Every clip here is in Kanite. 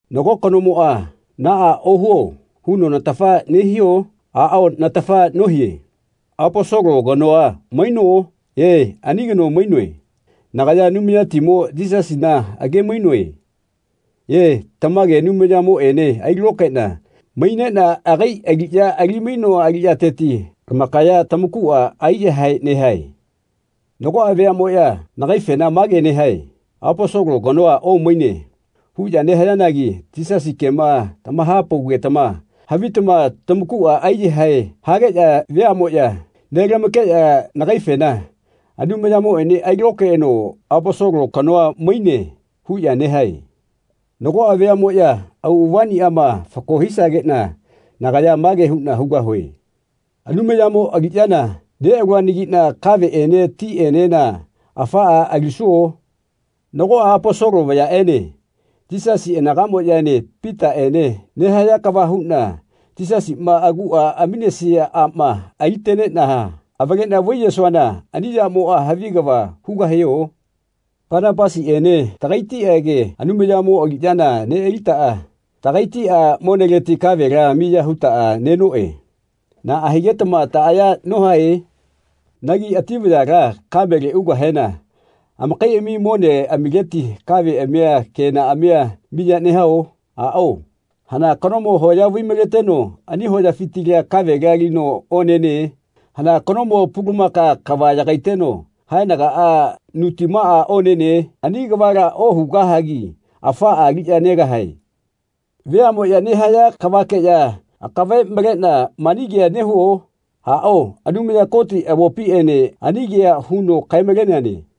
Nago kanomoꞌa “Naꞌa ohuo.” huno natafa nehio? Aꞌao natafa nohie. Aposolo kanoa maino? E, ani kano mainoe. Nagaya Anumayatimo Yisasina agemaino? E, tamage Anumayamoꞌene ailokaeꞌna maineꞌna agai aliꞌya ali-mainoa aliꞌyateti lamakaya tamakuꞌa aiyahae nehae. Nagoꞌa veaꞌmoꞌya nagaifena mage nehae “Aposolo kanoa omaine.” huꞌya nehayanagi Yisasi kema tamahapaugetama havitama tamakuꞌa aiyahae hageꞌya veaꞌmoꞌya nelamakeꞌya nagaifena “Anumayamoꞌene ailokaeno Aposolo kanoa maine.” huꞌya nehae. Nagoꞌa veaꞌmoꞌya auꞌavaꞌniꞌama fako hisageꞌna nagaya mage huꞌna hugahue. “Anumayamo aliꞌyana neꞌaluanagiꞌna kaveꞌene tiꞌenena afaꞌa alisuo? Nagoꞌa Aposolo vayaꞌene Yisasi aganaꞌamoꞌyaene Pitaꞌene nehaya kava huꞌna Yisasima aguꞌa aminesia aꞌma aliteneꞌna avaleꞌna vaiyesuana ani yamoꞌa havi kava hugahio? Panapasiꞌene taꞌagaitiꞌage Anumayamo aliꞌyana neꞌalitaꞌa taꞌagaitiꞌa moneleti kavela miya hutaꞌa nenoꞌe. Naꞌa higetama taꞌaya nohae? Nagi ati vayala kamele ugahena amakaiꞌami moneꞌamileti kaveꞌamia kenaꞌamia miya nehao? Aꞌao. Hana kanomo hoya vai-maleteno ani hoyafitila kavela alino onene? Hana kanomo pulumaka kava yagaiteno haenagaꞌa nutimaꞌa onene? Ani kavala ohugahagi afaꞌa aliꞌya negahae.” Veaꞌmoꞌya nehaya kavakeꞌya akave maleꞌna mani kea nehuo? Aꞌao, Anumaya Koti avopiꞌene ani kea huno kae-maleneane.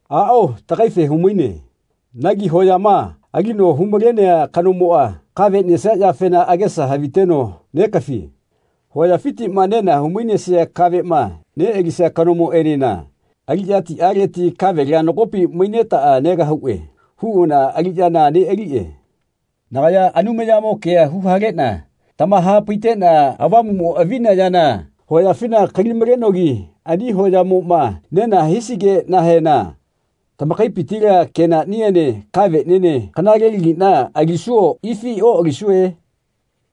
Aꞌao, tagaife humaine. Nagi hoyama alino humalenea kanomoꞌa kave nesia yafena agesa haviteno negafie. Hoyafitiꞌma nena humainesia kaveꞌma neꞌalisia kanomoꞌenena “Aliꞌyatiꞌaleti kavela nagopi mainetaꞌa negahuꞌe.” huꞌana aliꞌyana neꞌaliꞌe. Nagaya Anumayamo kea huhaleꞌna tamahapaiteꞌna Avamuꞌmo avina yana hoyafina kali-malenogi ani hoyamoꞌma nena hisigeꞌnahena tamakaipitila kenaꞌniene kaveꞌniene kanalelagiꞌna alisuo ifi oꞌalisue?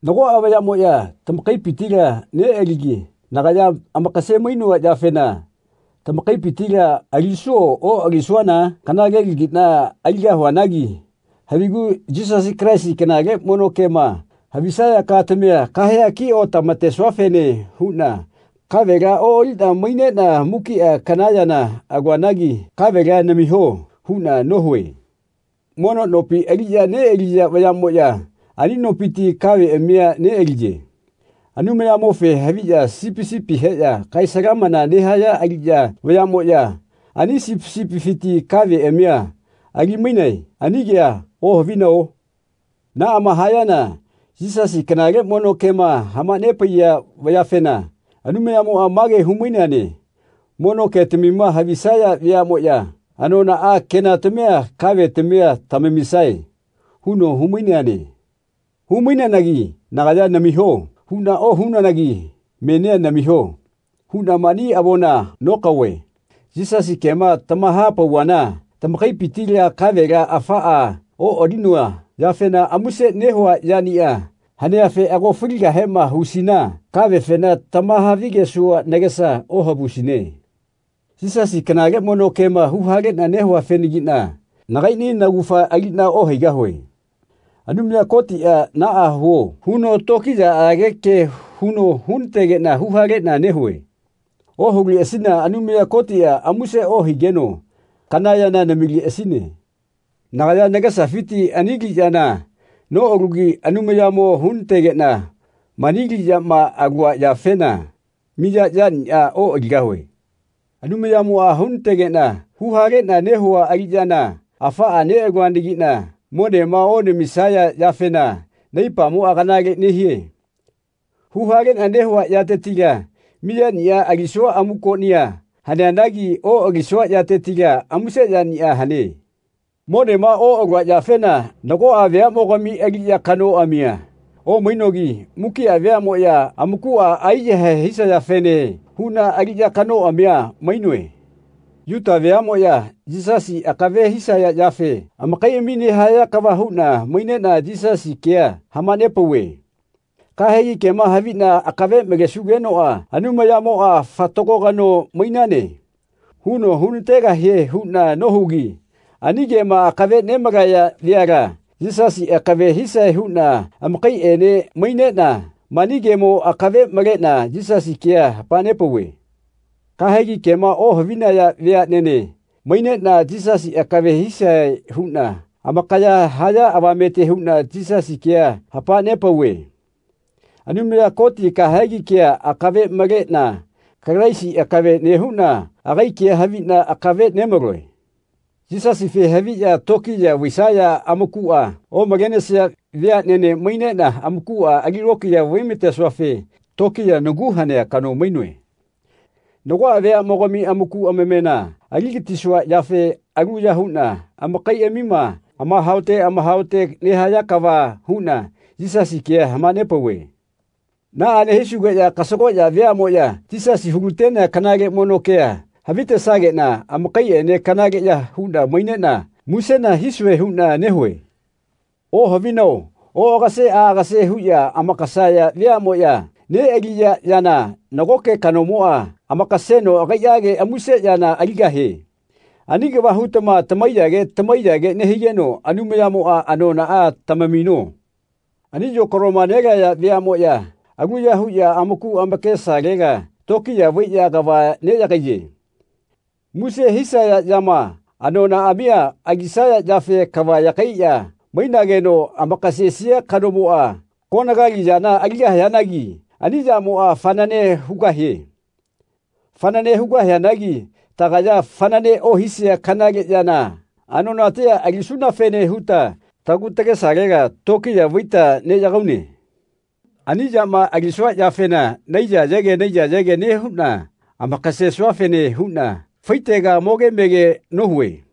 Nagoꞌa vayaꞌmoꞌya tamakaipitila neꞌaligi nagaya amakase-mainoa yafena tamakaipitila alisuo oꞌalisuana? Kanalelagiꞌna aligahuanagi havigu Yisasi Kalaisi kanale mono kema havisaya katamia kahea kiꞌotamatesuafene huꞌna kavela oꞌaliꞌna maineꞌna mukiꞌa kana yana aluanagi “Kavela namiho.” huꞌna nohue. Mono nopi aliꞌya neꞌaliya vayaꞌmoꞌya ani nopiti kaveꞌamia neꞌaliye. Anumayamofe haviꞌya sipi sipi heꞌya kae-salamana nehaya aliꞌya vayaꞌmoꞌya ani sipi sipifiti kaveꞌamia ali-mainae. Ani kea ohavinao? Naꞌama hayana Yisasi kanale mono kema hamanepaiya vayafena Anumayamoꞌa mage humaineane “Mono ketamima havisaya veaꞌmoꞌya anonaꞌa kenatamia kavetamia tamamisae.” huno humaineane. Humaineanagi nagaya “Namiho.” huꞌna ohunananagi menia “Namiho.” huꞌna mani avona nokaove. Yisasi kema tamahapauvana tamakaipitila kavela afaꞌa oꞌalinoa yafena muse nehua yaniꞌa haneafe ago faligahema husina kavefena tamahavigesua nagesa ohavusine. Yisasi kanale mono kema huhaleꞌna nehuafenagiꞌna nagaiꞌni naugafa aliꞌna ohaigahue. Anumaya Kotiꞌa “Naꞌa huo.” huno tokiyaꞌage ke huno hunategeꞌna huhaleꞌna nehue. Ohuleꞌasina Anumaya Kotiꞌa muse ohigeno kana yana namileꞌasine. Nagaya nagesafiti ani aliꞌyana noꞌalugi Anumayamo hunategeꞌna mani aliꞌyama alua yafena miya yaniꞌa oꞌaligahue. Anumayamoꞌa hunategeꞌna huhaleꞌna nehua aliꞌyana afaꞌa neꞌaluanagiꞌna monema onamisaya yafena naipamoꞌa kanale nehie. Huhaleꞌna nehua yatetila miyaniꞌa alisua amukoꞌnia haneanagi oꞌalisua yatetila muse yaniꞌa hane. Monema oꞌalua yafena nagoꞌa veaꞌmogami aliꞌya kanoꞌamia omainogi mukiꞌa veaꞌmoꞌya amakuꞌa aiyahae hisayafene huꞌna aliꞌya kanoꞌamia mainoe. Yuta veaꞌmoꞌya Yisasi akave hisaya yafe amakaiꞌami nehaya kava huꞌna maineꞌna Yisasi kea hamanepauve. Kahegi kema haviꞌna akave malesugenoꞌa Anumayamoꞌa “Fatago kano mainane.” huno hunategahie huꞌna nohugi ani kema akave nemalaya veala Yisasi akave hisae huꞌna amakaiꞌene maineꞌna mani kemo akave maleꞌna Yisasi kea hamanepauve. Kahegi kema ohavinaya veaꞌnene maineꞌna Yisasi akave hisae huꞌna amakaya haya avamete huꞌna Yisasi kea hamanepauve. Anumaya Koti kahegi kea akave maleꞌna Kalaisi akave nehuꞌna agai kea haviꞌna akave nemaloe. Yisasife haviꞌya tokiya vaisaya amakuꞌa omalenesia veaꞌnene maineꞌna amakuꞌa ali lokiya vaimatesuafe tokiya nagu hanea kano omainoe. Nagoꞌa veaꞌmogami amaku amamena aligatisua yafe aluya huꞌna amakaiꞌamima amahaote amahaote nehaya kava huꞌna Yisasi kea hamanepauve. Naꞌa nehisugeꞌya kasagoꞌya veaꞌmoꞌya Yisasi hulatenea kanale mono kea havitesageꞌna amakaiꞌene kanaleꞌya huꞌna maineꞌna musena hisue huꞌna nehue. Ohavinao oꞌagase aꞌagase huꞌya amakasaya veaꞌmoꞌya neꞌaliya yana nagoke kanomoꞌa amakaseno agaiꞌage muse yana aligahie. Ani kava hutama tamaiyage tamaiyage nehigeno Anumayamoꞌa anonaꞌa tamamino. Ani yokaloma nelaya veaꞌmoꞌya aluya huꞌya amaku amakesalela tokiya vaiꞌya kava neꞌyagaiye. Muse hisaya yama anonaꞌamia alisaya yafe kava yagaiꞌya mainageno amakasesia kanomoꞌa konagali yana aligahianagi ani yamoꞌa fanane hugahie. Fanane hugahianagi tagaya fanane ohisia kanale yana anonatia alisunafene huta tagu tagesalela tokiya vaita neꞌyagaune. Ani yama alisua yafena naiyayege naiyayege nehuꞌna amakasesuafene huꞌna faitega moge mege nohue.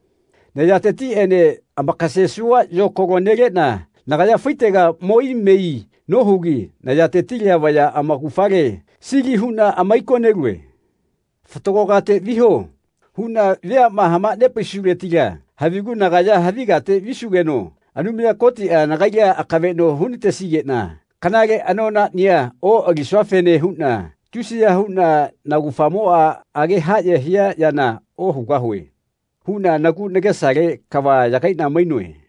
Nayatetiꞌene amakasesua yokaloa neleꞌna nagaya faitega mo ai me ai nohugi nayatetila vaya amaugafale sili huꞌna amaikonelue. “Fatago kate viho.” huꞌna veaꞌma hamanepaisuletila havigu nagaya havi kate visugeno Anumaya Kotiꞌa nagaila akaveꞌno hunatesigeꞌna kanale anonaꞌnia oꞌalisuafene huꞌna tusiya huꞌna “Naugafamo age haꞌye hia yana ohugahue.” huꞌna nagu nagesale kava yagaiꞌna mainoe.